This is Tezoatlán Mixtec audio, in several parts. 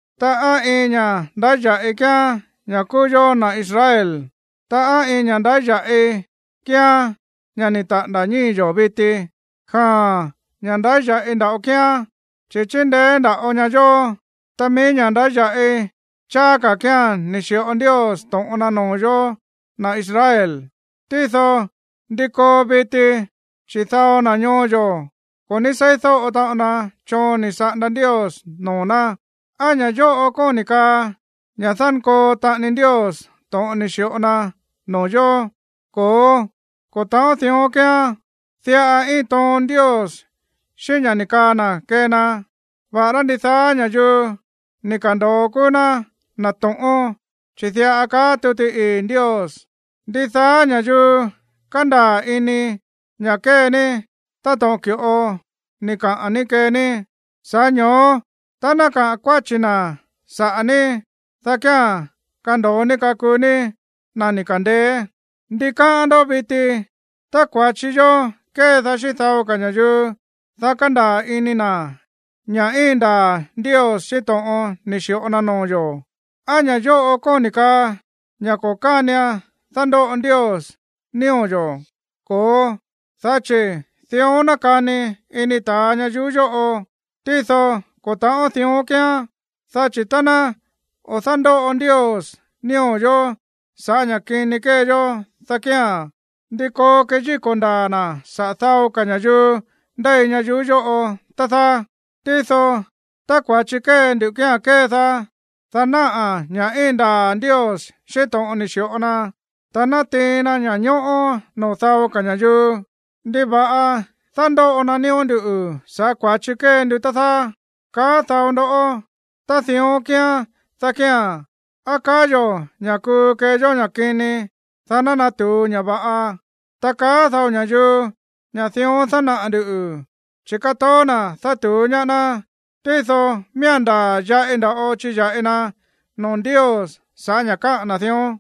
Ta, ¿á iin ña̱ ndáya̱ꞌi kíán ña̱ kúú yó na̱ Israel? Ta, ¿á iin ña̱ ndáya̱ꞌi kíán ña̱ ni̱ taꞌa̱nda̱ ñíi̱ yo̱ viti? Jaa̱n, ña̱ ndáya̱ꞌi nda̱ꞌo kíán, chi̱ chíndeé nda̱ꞌo ña yo̱. Ta mií ña̱ ndáya̱ꞌi cháá ka̱ kía̱n ni̱ xi̱ꞌo Ndios to̱ꞌon na noo̱ yo̱, na̱ Israel. Tído, ¿ndi koo viti, chi̱ dao na̱ ñoo yo̱ ko̱ ní seídóꞌo taꞌon na choon ni̱ saꞌanda Ndios noo̱ ná? ¿Á ña̱ yóꞌo kóni̱ kaa ña̱ dánkoo taꞌani Ndios to̱ꞌon ni̱ xi̱ꞌo na noo̱ yo̱? Ko̱ó, ko̱ ta̱ꞌón dión kíán. Diꞌa íin toon Ndios xíꞌín ña̱ ni̱ kaa na̱ kee na, va̱ꞌará ndidaá ña̱yuu ni̱ ka̱ndo̱o kúú ná na̱ to̱ꞌón, chi̱ diꞌa kaá tuti ii̱ Ndios: Ndidaá ña̱yuu kandaa̱ ini ña̱ kée ní táto̱ꞌon ki̱ꞌo ni̱ kaꞌa̱n ní kee ní, sa̱ꞌá ño̱ó tá ná kaꞌa̱n kuáchi̱ na̱ saꞌa̱ ní, dá kía̱n kando̱o ní kakuu ní na̱ ni̱ ka̱ndeé. ¿Ndi káꞌán ndoꞌó viti? Tá kua̱chi yó kédaá xíꞌín dao ka̱ ña̱yuu, dá kándaa̱ ini na̱ ña̱ íin ndaa̱ Ndios xíꞌín to̱ꞌon ni̱ xi̱ꞌo na noo̱ yo̱, ¿á ña̱ yóꞌo kóni̱ kaa ña̱ ko̱ kánian dándóꞌo Ndios nío̱ yo̱? Ko̱ó, dá chi̱ dión nákani ini ta̱a ñayuú yóꞌo. Tído ko̱ ta̱ꞌón dión kíán, dá chi̱ tá ná o̱ dándóꞌo Ndios nío̱ yo̱ sa̱ꞌá ña̱ kini kée yó, dá kía̱n, ¿ndí koo keyíko̱ ndaa̱ na̱ saꞌa̱ dao ka̱ ña̱yuu ndéi ñayuú yóꞌo, tá dáá? Tído, tá kua̱chi kée ndu kía̱n kédaá, dá náꞌa̱ ña̱ íin ndaa̱ Ndios xíꞌín to̱ꞌon ni̱ xi̱ꞌo na, ta nátiin na ña̱ñóꞌó noo̱ dao ka̱ ña̱yuu, ¿ndiva̱ꞌa dándóꞌo na nío̱ ndú sa̱ꞌá kua̱chi kée ndu, tá dáá?, kaá dao ndó. Tá dión kíán, dá kía̱n, ¿á kaa yo̱ ña̱ kuu kee yó ña̱ kini, dá ná natu̱u ña̱ va̱ꞌa? Ta kaá dao ña̱yuu ña̱ dión dánaꞌa̱ ndu̱, chi̱ kátoó na̱ dátu̱ú ñaá ná, tído miía̱n ndaa̱ yaꞌi nda̱ꞌo chiya̱ꞌi na noo̱ Ndios sa̱ꞌá ña̱ káꞌa̱n na̱ dión.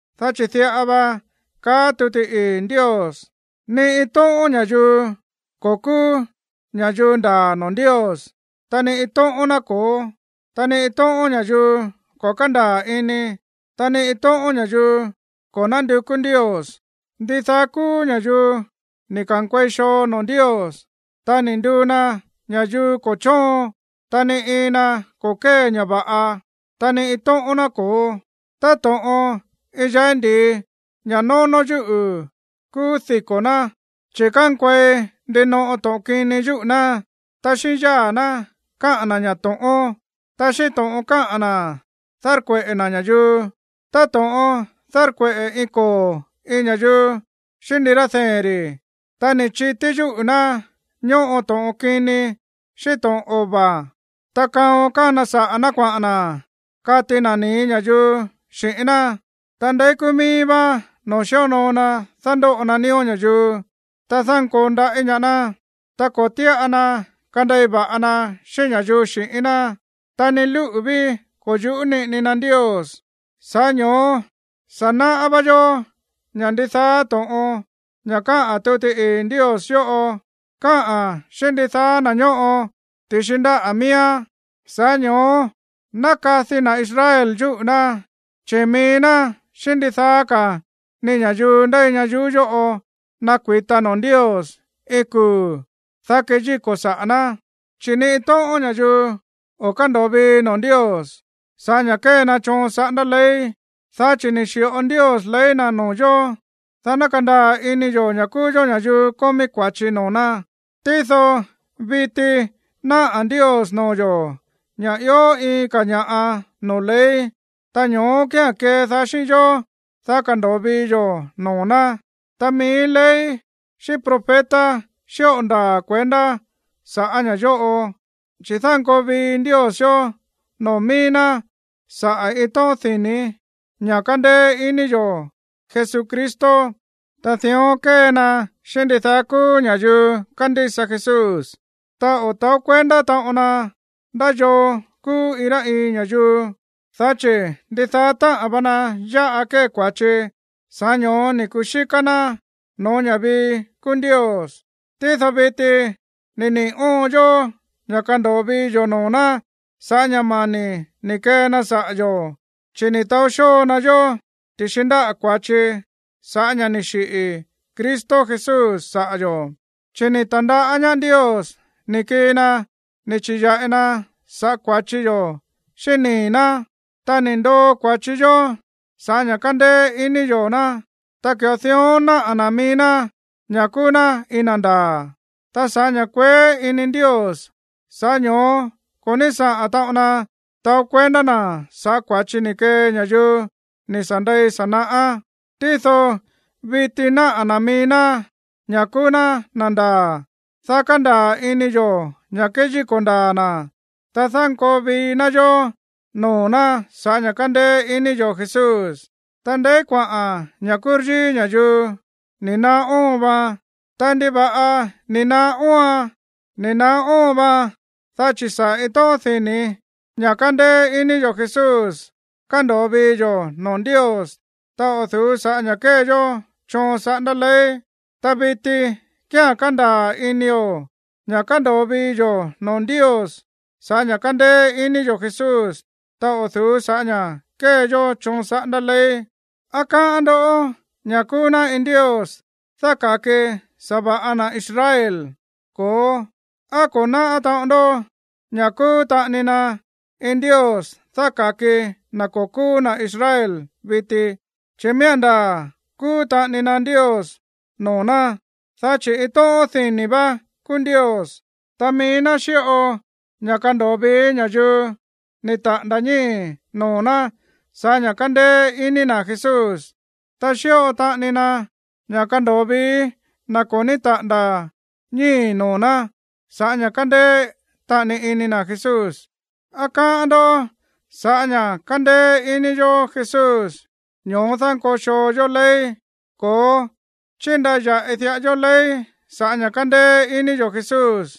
Dá chi̱ diꞌa va kaá tuti ii̱ Ndios: Ni iin tóꞌón ña̱yuu ko̱ kúú ña̱yuu ndaa̱ noo̱ Ndios, ta ni iin tóꞌón ná ko̱ó. Ni iin tóꞌón ña̱yuu ko̱ kándaa̱ ini, ta ni iin tóꞌón ña̱yuu ko̱ nándukú Ndios. Ndidaá kúú ña̱yuu ni̱ ka̱nkuei xoo noo̱ Ndios, ta ni̱ nduu na ña̱yuu ko̱ chóon. Ta ni iin na ko̱ kée ña̱ va̱ꞌa, ta ni iin tóꞌón ná ko̱ó. Táto̱ꞌon iin yái̱ ndi̱i ña̱ nónó yúꞌu̱ kúú diko̱ ná, chi̱ kánkuei ndinoꞌo to̱ꞌon kini yúꞌu̱ ná. Ta xíꞌín yáa̱ ná káꞌa̱n na̱ ña̱ to̱ꞌón. Ta xíꞌín to̱ꞌon káꞌa̱n na̱ dárkueꞌe̱ na̱ ña̱yuu, táto̱ꞌon dárkueꞌe̱ iin koo̱ iin ña̱yuu xíꞌín ndirá dee̱n ri̱. Ta ni̱ chití yúꞌu̱ ná ñóꞌo to̱ꞌon kini xíꞌín to̱ꞌon ova̱. Ta kaon kána saꞌa̱ ná kuaꞌa̱n na̱ kati na ni̱í ña̱yuu xi̱ꞌín ná. Ta ndeí kúú míí vá no̱ó xíonoo na dándóꞌo na nío̱ ña̱yuu, ta dánkoo ndaꞌí ñaá ná. Ta ko̱ tíꞌa na kandei va̱ꞌa na xíꞌín ña̱yuu xi̱ꞌín ná. Ta ni lúꞌu̱ ví ko̱ yu̱ꞌú niꞌini na Ndios. Sa̱ꞌá ño̱ó sa̱ náꞌá vá yó ña̱ ndidaá to̱ꞌon ña̱ káꞌa̱n tuti ii̱ Ndios yóꞌo, káꞌa̱n xíꞌín ndidaá na̱ ñóꞌo ti̱xi ndáꞌa̱ miíán. Sa̱ꞌá ño̱ó ná kadi na̱ Israel yúꞌu̱ ná, chi̱ mií ná xíꞌín ndidaá ka̱ ni ña̱yuu ndéi ñayuú yóꞌo nakui̱ta noo̱ Ndios iin kuu̱, dá keyíko̱ sa̱ꞌá ná. Chi̱ ni iin tóꞌón ña̱yuu o̱ kándo̱o vii noo̱ Ndios sa̱ꞌá ña̱ kée na choon saꞌándá ley. Dá chi̱ ni̱ xi̱ꞌo Ndios ley na̱ noo̱ yo̱, dá ná kandaa̱ ini yo̱ ña̱ kúú yó ña̱yuu kómí kua̱chi noo̱ ná. Tído viti náꞌa̱ Ndios noo̱ yo̱ ña̱ ió iin ka̱ ña̱ꞌa noo̱ ley, ta ño̱ó kía̱n kédaá xíꞌín yó, dá kando̱o vii yo̱ noo̱ ná. Ta mií ley xíꞌín profeta xíꞌo ndaa̱ kuendá saꞌa̱ ña̱ yóꞌo, chi̱ dánkoo vii Ndios yo̱ noo̱ mií ná sa̱ꞌá iin tóꞌón dini̱ ña̱ kándéé iní yo̱ Jesucristo. Ta dión kée na xíꞌín ndidaá kúú ña̱yuu kándísa Jesús. Ta ko̱ ta̱ó kuendá taꞌon na ndá yoo kúú iin rá iin ña̱yuu, dá chi̱ ndidaá táꞌa̱n va na yáꞌa kée kua̱chi, sa̱ꞌá ño̱ó ni̱ kuxíká ná no̱ó ña̱ vii kúú Ndios. Tído viti ni̱ niꞌi̱ óon yó ña̱ kándo̱o vii yo̱ noo̱ ná sa̱ꞌá ña̱ mani̱ ni̱ kee na saꞌa̱ yo̱, chi̱ ni̱ taó xóo na yó ti̱xi ndáꞌa̱ kua̱chi sa̱ꞌá ña̱ ni̱ xiꞌi̱ Cristo Jesús saꞌa̱ yo̱. Chi̱ ni̱ ta̱ndaꞌá ñaá Ndios ni̱ kii na ni̱ chi̱ya̱ꞌi na saꞌa̱ kua̱chi yo̱ xíꞌín nii̱ ná, ta ni̱ ndoo kua̱chi yó sa̱ꞌá ña̱ kándéé iní yo̱ ná. Ta ki̱ꞌo dión náꞌa̱ na̱ mií ná ña̱ kúú ná iin na̱ ndaa̱. Ta sa̱ꞌá ña̱ kueé ini Ndios, sa̱ꞌá ño̱ó ko̱ ní saꞌa̱n taꞌon na taó kuendá na̱ saꞌa̱ kua̱chi ni̱ kee ña̱yuu ni̱ sa̱ ndei sa̱ naꞌá. Tído viti náꞌa̱ na̱ mií ná ña̱ kúú ná na̱ ndaa̱, dá kandaa̱ ini yo̱ ña̱ kéyíko̱ ndaa̱ na̱, ta dánkoo vii ná yó noo̱ ná sa̱ꞌá ña̱ kándéé iní yo̱ Jesús. Ta, ¿ndeí kuaꞌa̱n ña̱ kúryíí ña̱yuu? Ni naá óon vaan. Ta, ¿ndiva̱ꞌa ni̱ naá óoan? Ni̱ naá óon vaan dá chi̱ sa̱ꞌá iin tóꞌón di̱ní ña̱ kándéé iní yo̱ Jesús kándo̱o vii yo̱ noo̱ Ndios, ta o̱ du̱ú sa̱ꞌá ña̱ kée yó choon saꞌándá ley. Ta viti kía̱n kándaa̱ inio̱ ña̱ kándo̱o vii yo̱ noo̱ Ndios sa̱ꞌá ña̱ kándéé iní yo̱ Jesús, ta o̱ du̱ú sa̱ꞌá ña̱ kée yó choon saꞌándá ley. ¿Á káꞌán ndó ña̱ kúú ná iin Ndios dáka̱ki sa̱va̱ꞌa na̱ Israel? Ko̱ó. ¿Á ko̱ náꞌá taꞌon ndó ña̱ kúú taꞌani na iin Ndios dáka̱ki na̱ ko̱ kúú na̱ Israel viti? Chi̱ miía̱n ndaa̱ kúú taꞌani na Ndios noo̱ ná. Dá chi̱ iin tóꞌón dini̱ vá kúú Ndios, ta mií ná xíꞌo ña̱ kándo̱o vií ña̱yuu ni̱ taꞌa̱nda̱ ñíi̱ noo̱ ná sa̱ꞌá ña̱ kándéé iní na̱ Jesús, ta xíꞌo taꞌani na ña̱ kándo̱o vií na̱ ko̱ ní taꞌa̱nda̱ ñíi̱ noo̱ ná sa̱ꞌá ña̱ kándéé taꞌani ini na̱ Jesús. ¿Á káꞌán ndó ña̱ sa̱ꞌá ña̱ kándéé iní yo̱ Jesús, ñoó dánkoo xoo yó ley? Ko̱ó, chíndaya̱ꞌi diꞌa yó ley sa̱ꞌá ña̱ kándéé iní yo̱ Jesús.